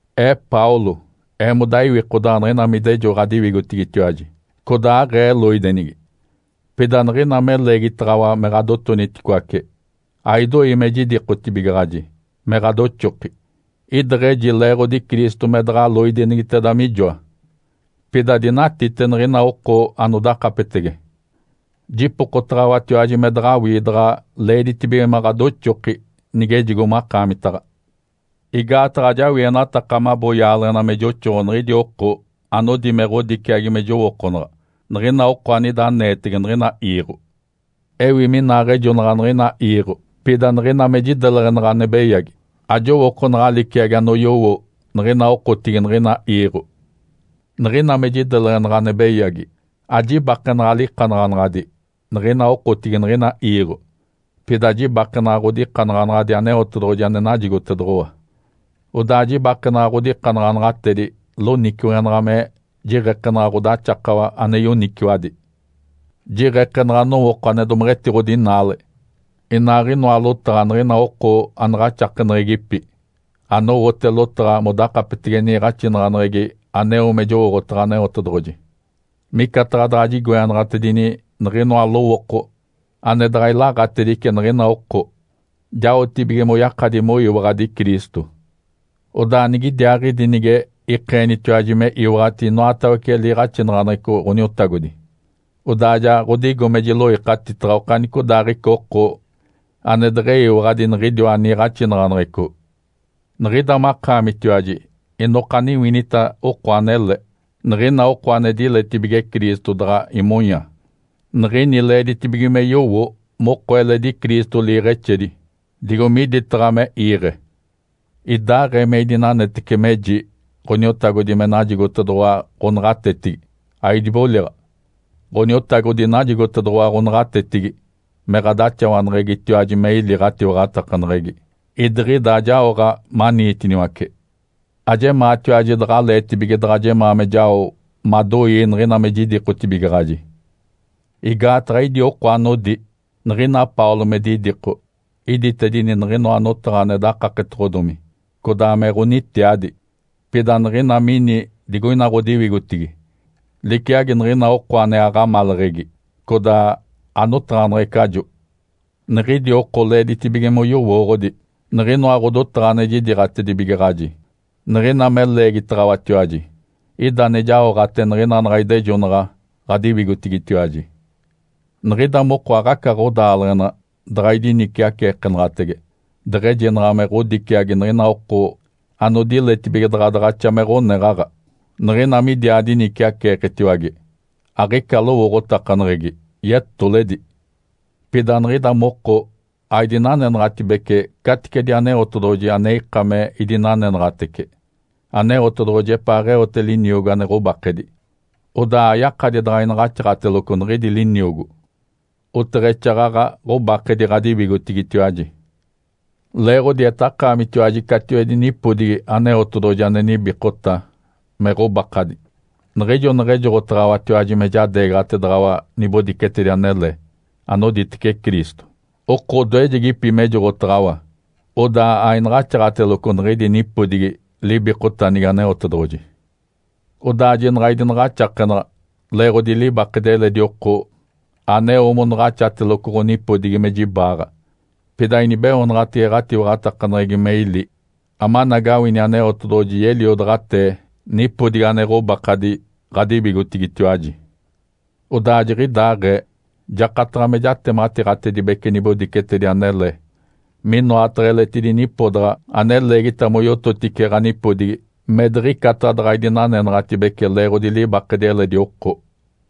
Ee Paulo, eemoda iwikodaɡ̶a niɡ̶ina me idejo ɡ̶adiwigotigitiwaji, codaa aɡ̶ee loidenigi. Pida niɡ̶ina me leegitaɡ̶awa me ɡ̶adotoniticoace, aidoi me jidikotibigaɡ̶aji me ɡ̶adoxoki. Ideɡ̶eji leeɡ̶odi Cristo me daɡ̶a loidenigiteda mijoa, pida dinatite niɡ̶ina oko anodakapetege, jipokotaɡ̶awatiwaji me daɡ̶awii daɡ̶a leeditibige me ɡ̶adoxoki nigejigo makaamitaɡ̶a. Igaataɡ̶a ajawienataka mabo yaaleɡ̶ena me joxoɡ̶o niɡ̶idi oko anodi me ɡ̶odiciagi me jowookonaɡ̶a niɡ̶ina oko anida aneetege niɡ̶ina iiɡ̶o. Ewi minaaɡ̶ejonaɡ̶a niɡ̶ina iiɡ̶o, pida niɡ̶ina me jideleɡ̶enaɡ̶a ane beyagi, ajowookonaɡ̶a liciagi anoyowo niɡ̶ina okotigi niɡ̶ina iiɡ̶o. Niɡ̶ina me jideleɡ̶enaɡ̶a ane beyagi, ajibakenaɡ̶a likanaɡ̶anaɡ̶adi niɡ̶ina okotigi niɡ̶ina iiɡ̶o. Pida jibakenaɡ̶a ɡ̶odikanaɡ̶anaɡ̶adi Aneotedoɡ̶oji ane najigotedoɡ̶owa. Odaa jibakenaɡ̶a ɡ̶odikanaɡ̶anaɡ̶atedi loniciweɡ̶enaɡ̶a me jiɡ̶ekenaɡ̶a ɡ̶odaxakawa ane yoniciwadi. Jiɡ̶ekenaɡ̶a nowooko ane domeɡ̶etiɡ̶odinaale, inaaɡ̶inoa lotaɡ̶a niɡ̶ina oko anaɡ̶axakeneɡ̶egipi, anowote lotaɡ̶a modakapetege niiɡ̶axinaɡ̶aneɡ̶egi aneo me jowooɡ̶otaɡ̶a Aneotedoɡ̶oji. Micataɡ̶a daɡ̶a jigoenaɡ̶atedini niɡ̶inoa lowooko ane daɡ̶a ilaaɡ̶atedice niɡ̶ina oko, jaoɡ̶atibige moyakadi moyiwaɡ̶adi Cristo. Odaa nigidiaaɡ̶idi nige ikeenitiwaji me iwaɡ̶ati inoatawece liiɡ̶axinaɡ̶aneɡ̶eco Ǥoniotagodi, odaa ja ɡ̶odigo me jiloikatitaɡ̶a okanicodaaɡ̶ica oko ane deɡ̶eyiwaɡ̶adi niɡ̶idiwa niiɡ̶axinaɡ̶aneɡ̶eco. Niɡ̶ida makaamitiwaji inokaniwinita oko anele. Niɡ̶ina oko ane diletibige Cristo daɡ̶a imonya, niɡ̶ini leeditibige me yowo moko eledi Cristo liiɡ̶exedi, digo miditaɡ̶a me iiɡ̶e. Idaaɡ̶ee me idinanetece meji Ǥoniotagodi me najigotedoɡ̶owa ɡ̶onaɡ̶atetigi, aidiboliɡ̶a. Ǥoniotagodi najigotedoɡ̶owa ɡ̶onaɡ̶atetigi me ɡ̶adaxawaneɡ̶egitiwaji me ili ɡ̶atiwaɡ̶atakaneɡ̶egi, idiɡ̶ida ajaoɡ̶a maniitiniwace. Ajemaatiwaji daɡ̶aleetibige daɡ̶a jemaa me jao madoii niɡ̶ina me jidikotibigaɡ̶aji. Igaataɡ̶a idi oko anodi, “Niɡ̶ina Paulo me didiko, iditedini niɡ̶inoa notaɡ̶a ane dakaketoɡ̶odomi codaa me ɡ̶onitiadi. Pida niɡ̶ina mini digoina ɡ̶odiwigotigi, liciagi niɡ̶ina oko ane aɡ̶amaleɡ̶egi, codaa anotaɡ̶aneɡ̶ecajo.” Niɡ̶idi oko leeditibige moyowooɡ̶odi niɡ̶inoa ɡ̶odotaɡ̶a ane jidiiɡ̶atibigaɡ̶aji niɡ̶ina me leegitaɡ̶awatiwaji, ida ane jaoɡ̶ate niɡ̶ina naɡ̶a idejonaɡ̶a ɡ̶adiwigotigitiwaji. Niɡ̶ida moko aɡ̶aca ɡ̶odaaleɡ̶ena daɡ̶a idiniciaceekenaɡ̶atege, deɡ̶ejinaɡ̶a me ɡ̶odiciagi niɡ̶ina oko anodiletibige daɡ̶a daɡ̶axa me ɡ̶oneɡ̶aɡ̶a. Niɡ̶ina midiaa diniciaceeketiwage, aɡ̶ica lowooɡ̶otakaneɡ̶egi, yetoledi! Pida niɡ̶ida moko aidinanenaɡ̶atibece caticedi Aneotedoɡ̶oji ane ika me idinanenaɡ̶atece. Aneotedoɡ̶oji epaaɡ̶eote liniogo ane ɡ̶obakadi, odaa ayakadi daɡ̶a inaɡ̶axaɡ̶ateloco niɡ̶idi liniogo, oteɡ̶exaaɡ̶aɡ̶a ɡ̶obakedi ɡ̶adiwigotigitiwaji. Leeɡ̶odi etakaamitiwaji catiwedi nipodigi Aneotedoɡ̶oji ane nibikota me ɡ̶obakadi. Niɡ̶ijo neɡ̶ejoɡ̶otaɡ̶awatiwaji me jadeegaɡ̶ataɡ̶awa nibodicetedi anele anoditece Cristo, oko odoejegipi mejoɡ̶otaɡ̶awa, odaa ainaɡ̶axaɡ̶ateloco niɡ̶idi nipodigi libikotanigi Aneotedoɡ̶oji. Odaa jinaɡ̶a idinaɡ̶axakenaɡ̶a leeɡ̶odi libakedi eledi oko aneo monaɡ̶axateloco ɡ̶onipodigi me jibaaɡ̶a. Pida inibeoonaɡ̶atege ɡ̶atiwaɡ̶atakaneɡ̶egi me ili amanagawini Aneotedoɡ̶oji yeliodaɡ̶atee nipodigi ane ɡ̶obakadi ɡ̶adiwigotigitiwaji. Odaa jiɡ̶idaaɡ̶ee jakataɡ̶a me jatematiiɡ̶atedibece nibodicetedi anele minoataɡ̶a eletidi nipodaɡ̶a ane leegita moyototice ɡ̶anipodigi me diɡ̶icata daɡ̶a idinanenaɡ̶atibece leeɡ̶odi libakedi eledi oko.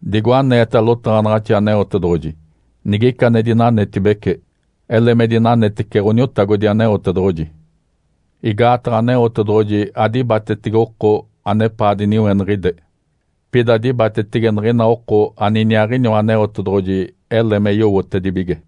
Digo aneeta lotaɡ̶anaɡ̶axi Aneotedoɡ̶oji, “Nigica ane dinanetibece, ele me dinanetece Ǥoniotagodi Aneotedoɡ̶oji.” Igaataɡ̶a Aneotedoɡ̶oji adibatetege oko anepaa diniweniɡ̶ide, pida dibatetege niɡ̶ina oko aniniaaɡ̶iniwa Aneotedoɡ̶oji ele me yowotedibige.